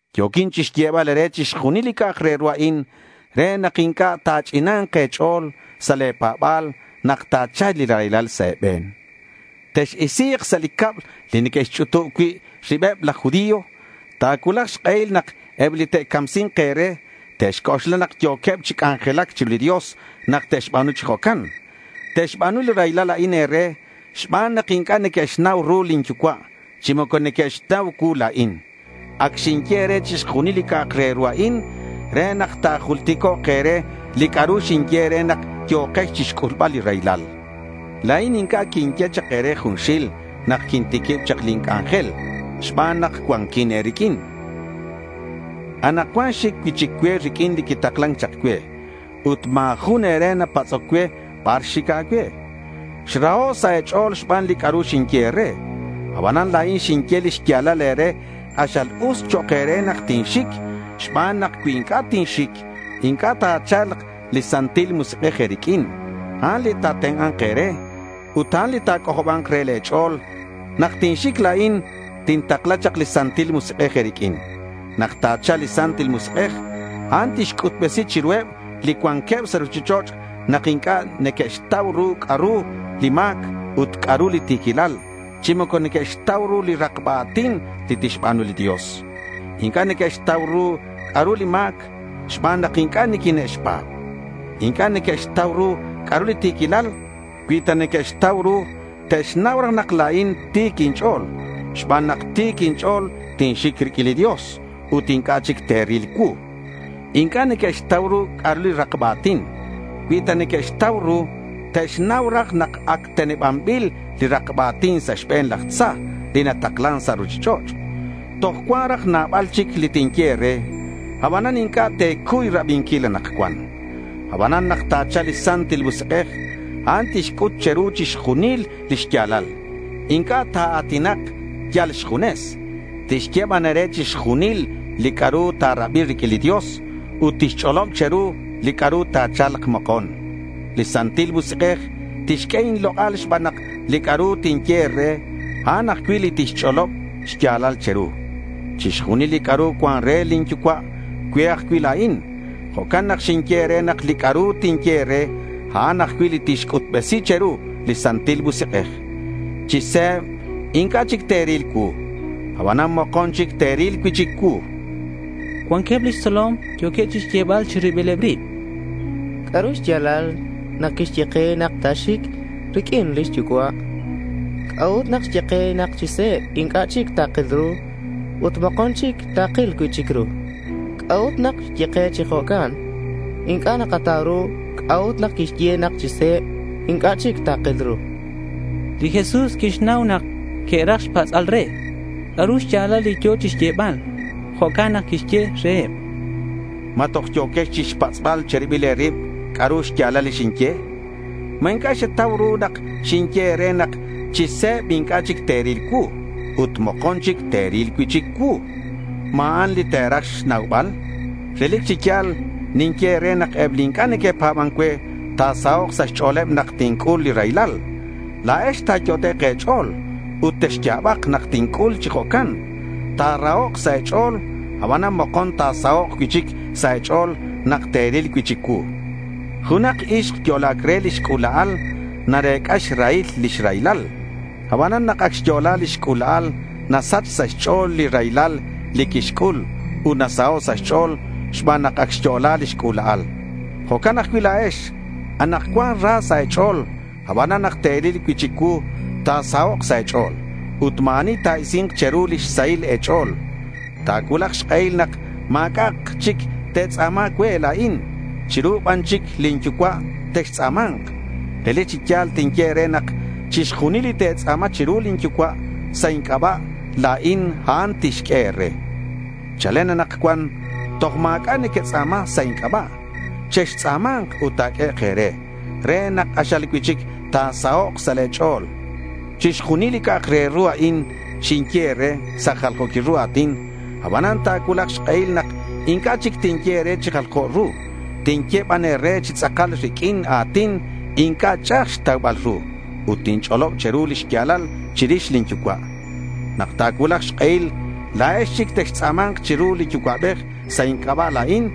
Yo̱quin chixyebal e̱re chixjunil li c'a'ak re ru a'in re nak inc'a' ta̱ch'ina̱nk e̱ch'o̱l sa' le̱ pa̱ba̱l nak ta̱cha̱lk li raylal sa' e̱be̱n. Tex-isi̱k sa' li cab li neque'xch'utub cui' ribeb laj judío. Ta̱cuulak xk'ehil nak eb li te'camsi̱nk e̱re te'xc'oxla nak yo̱queb chi c'anjelac chiru li Dios nak te'xba̱nu chi jo'can. Te'xba̱nu li raylal a'in e̱re xban nak inc'a' neque'xnau ru lin Yucua' chi moco neque'xnau cuu la̱in. Ac xinye e̱re chixjunil li c'a'ak re ru a'in re nak ta̱julticok' e̱re li c'a'ru xinye e̱re nak yo̱kex chixc'ulbal li raylal. La̱in inc'a' quinye chak e̱re junxil nak quintiquib chak lin c'anjel xban nak cuanquin e̱riq'uin. Anakcuan xic cui'chic cue riq'uin li quitaklan chak cue. Ut ma̱ jun e̱re napatz'oc cue bar xic cue. Xraho' sa' e̱ch'o̱l xban li c'a'ru xinye e̱re. Abanan la̱in xinye li xya̱lal e̱re. K'axal us chok' e̱re nak tinxic xban nak cui inc'a' ninxic, inc'a' ta̱cha̱lk li Santil Musik'ej e̱riq'uin. A'an li ta̱tenk'a̱nk e̱re ut a'an li ta̱c'ojoba̱nk re le̱ ch'o̱l. Nak tinxic, la̱in tintakla chak li Santil Musik'ej e̱riq'uin. Nak ta̱cha̱lk li Santil Musik'ej, a'an tixc'utbesi chiruheb li cuanqueb sa' ruchich'och' nak inc'a' neque'xtau ru c'a'ru li ma̱c ut c'a'ru li ti̱quilal chi moco neque'xtau ru li rakba a̱tin li tixba̱nu li Dios. Inc'a' neque'xtau ru c'a'ru li ma̱c xban nak inc'a' niquine'xpa̱b. Inc'a' neque'xtau ru c'a'ru li ti̱quilal. Cui ta que'xtau ru te'xnau raj nak la̱in ti̱c inch'o̱l. Xban nak ti̱c inch'o̱l, tinxic riq'uin li Dios ut inc'a' chic te̱ril cuu. Inc'a' neque'xtau ru c'a'ru li rakba a̱tin. Cui ta que'xtau ru, te'xnau raj nak ac tenebanbil li rakba a̱tin sa' xbe̱n laj tza li nataklan sa' ruchich'och'. Toj cuan raj nabal chic li tinye e̱re, abanan inc'a' te̱cuy rabinquil anakcuan. Abanan nak ta̱cha̱lk li Santil Musik'ej, a'an tixc'ut che̱ru chixjunil li xya̱lal. Inc'a' ta̱a̱tinak yal xjunes. Tixye ban e̱re chixjunil li c'a'ru ta̱rabi riq'uin li Dios ut tixch'olob che̱ru li c'a'ru ta̱cha̱lk mokon. Li Santil Musik'ej tixq'ue inlok'al xban nak li c'a'ru tinye re, a'an ajcui' li tixch'olob xya̱lal che̱ru. Chixjunil li c'a'ru cuan re lin Yucua', cue ajcui' la̱in. Jo'can nak xinye e̱re nak li c'a'ru tinye e̱re, a'an ajcui' li tixc'utbesi che̱ru li Santil Musik'ej. —Chi se̱b inc'a' chic te̱ril cuu. Abanan mokon chic te̱ril cui'chic cuu, chan li Jesús. Cuanqueb lix tzolom yo̱queb chixyebal chi ribileb rib: —¿C'a'ru xya̱lal nak xye ke nak ta̱xic riq'uin lix yucua'? ¿C'a'ut nak xye ke nak chi se̱b inc'a' chic takil ru ut mokon chic takil cui'chic ru? ¿C'a'ut nak xye chi jo'can? Inc'a' nakatau ru c'a'ut nak quixye nak chi se̱b inc'a' chic takil ru, chanqueb. Li Jesús quixnau nak que'raj xpatz'bal re c'a'ru xya̱lal li yo̱ chixyebal. Jo'can nak quixye reheb: —¿Ma yo̱quex chixpatz'bal che̱ribil e̱rib c'a'ru xya̱lal li xinye? ¿Ma inc'a' xetau ru nak xinye e̱re nak chi se̱b inc'a' chic te̱ril cuu ut mokon chic te̱ril cui'chic cuu? ¿Ma a'an li te̱raj xnaubal? Relic chi ya̱l ninye e̱re nak eb li inc'a' neque'pa̱ban cue ta̱sahok' sa' xch'o̱leb nak tinc'ul li raylal. La̱ex ta̱yot'ek' e̱ch'o̱l ut texya̱bak nak tinc'ul chi jo'can. Ta̱rahok' sa' e̱ch'o̱l, abanan mokon ta̱sahok' cui'chic sa' e̱ch'o̱l nak te̱ril cui'chic cuu. Junak ixk yo'la̱c re lix c'ula'al narec'a xrahil lix raylal. Abanan nak ac xyo'la lix c'ula'al, nasach sa' xch'o̱l li raylal li quixc'ul ut nasaho' sa' xch'o̱l xban nak ac xyo'la lix c'ula'al. Jo'can ajcui' la̱ex. Anakcuan ra sa' e̱ch'o̱l. Abanan nak te̱ril cui'chic cuu, ta̱sahok' sa' e̱ch'o̱l. Ut ma̱ ani ta̱isi̱nk che̱ru lix sahil e̱ch'o̱l. Ta̱cuulak xk'ehil nak ma̱c'a' chic te̱tz'a̱ma cue la̱in. Chiru ban chic lin Yucua' textz'a̱ma̱nk. Relic chi ya̱l tinye e̱re nak chixjunil li te̱tz'a̱ma chiru lin Yucua' sa' inc'aba' la̱in, a'an tixq'ue e̱re. Chalen anakcuan toj ma̱c'a' nequetz'a̱ma sa' inc'aba'. Chextz'a̱ma̱nk ut ta̱q'uehek' e̱re re nak k'axal cui'chic ta̱sahok' sa' e̱ch'o̱l, chan li Jesús. Chixjunil li c'a'ak re ru a'in xinye e̱re sa' jaljo̱quil ru a̱tin. Abanan ta̱cuulak xk'ehil nak inc'a' chic tinye e̱re chi jaljo ru. Tinye ban e̱re chi tz'akal riq'uin a̱tin inc'a' ch'a'aj xtaubal ru ut tinch'olob che̱ru li xya̱lal chirix lin Yucua'. Nak ta̱cuulak xk'ehil la̱ex chic textz'a̱ma̱nk chiru li Yucua'bej sa' inc'aba' la̱in.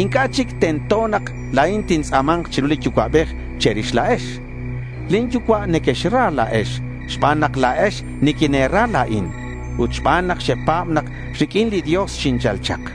Inc'a' chic tento nak la̱in tintz'a̱ma̱nk chiru li Yucua'bej che̱rix la̱ex. Lin Yucua' nequexra la̱ex xban nak la̱ex niquine̱ra la̱in ut xban nak xepa̱b nak riq'uin li Dios xinchal chak.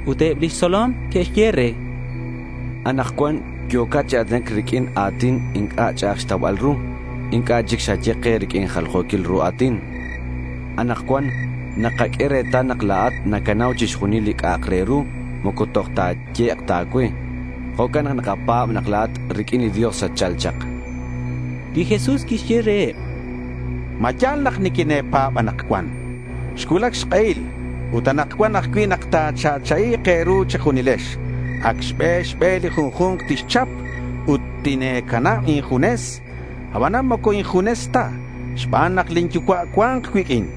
Ut eb lix tzolom que'xye re: —Anakcuan yo̱cat chi a̱tinac riq'uin a̱tin inc'a' ch'a'aj xtaubal ru. Inc'a' chic xaye ke riq'uin jaljo̱quil ru a̱tin. Anakcuan nakaq'ue retal nak la̱at nacanau chixjunil li c'a'ak re ru. Moco toj ta ta̱yehek' a̱cue. Jo'can nak nakapa̱b nak la̱at riq'uin li Dios xatchal chak, chanqueb. Li Jesús quixye reheb: —¿Ma ya̱l nak niquine̱pa̱b anakcuan? Xcuulac xk'ehil, ut anakcuan ajcui', nak ta̱cha'cha'i̱k e̱ru che̱junilex. Ac xbe xbe li junju̱nk tixchap ut tine̱canab injunes. Abanan moco injunes ta xban nak lin Yucua' cua̱nk cuiq'uin.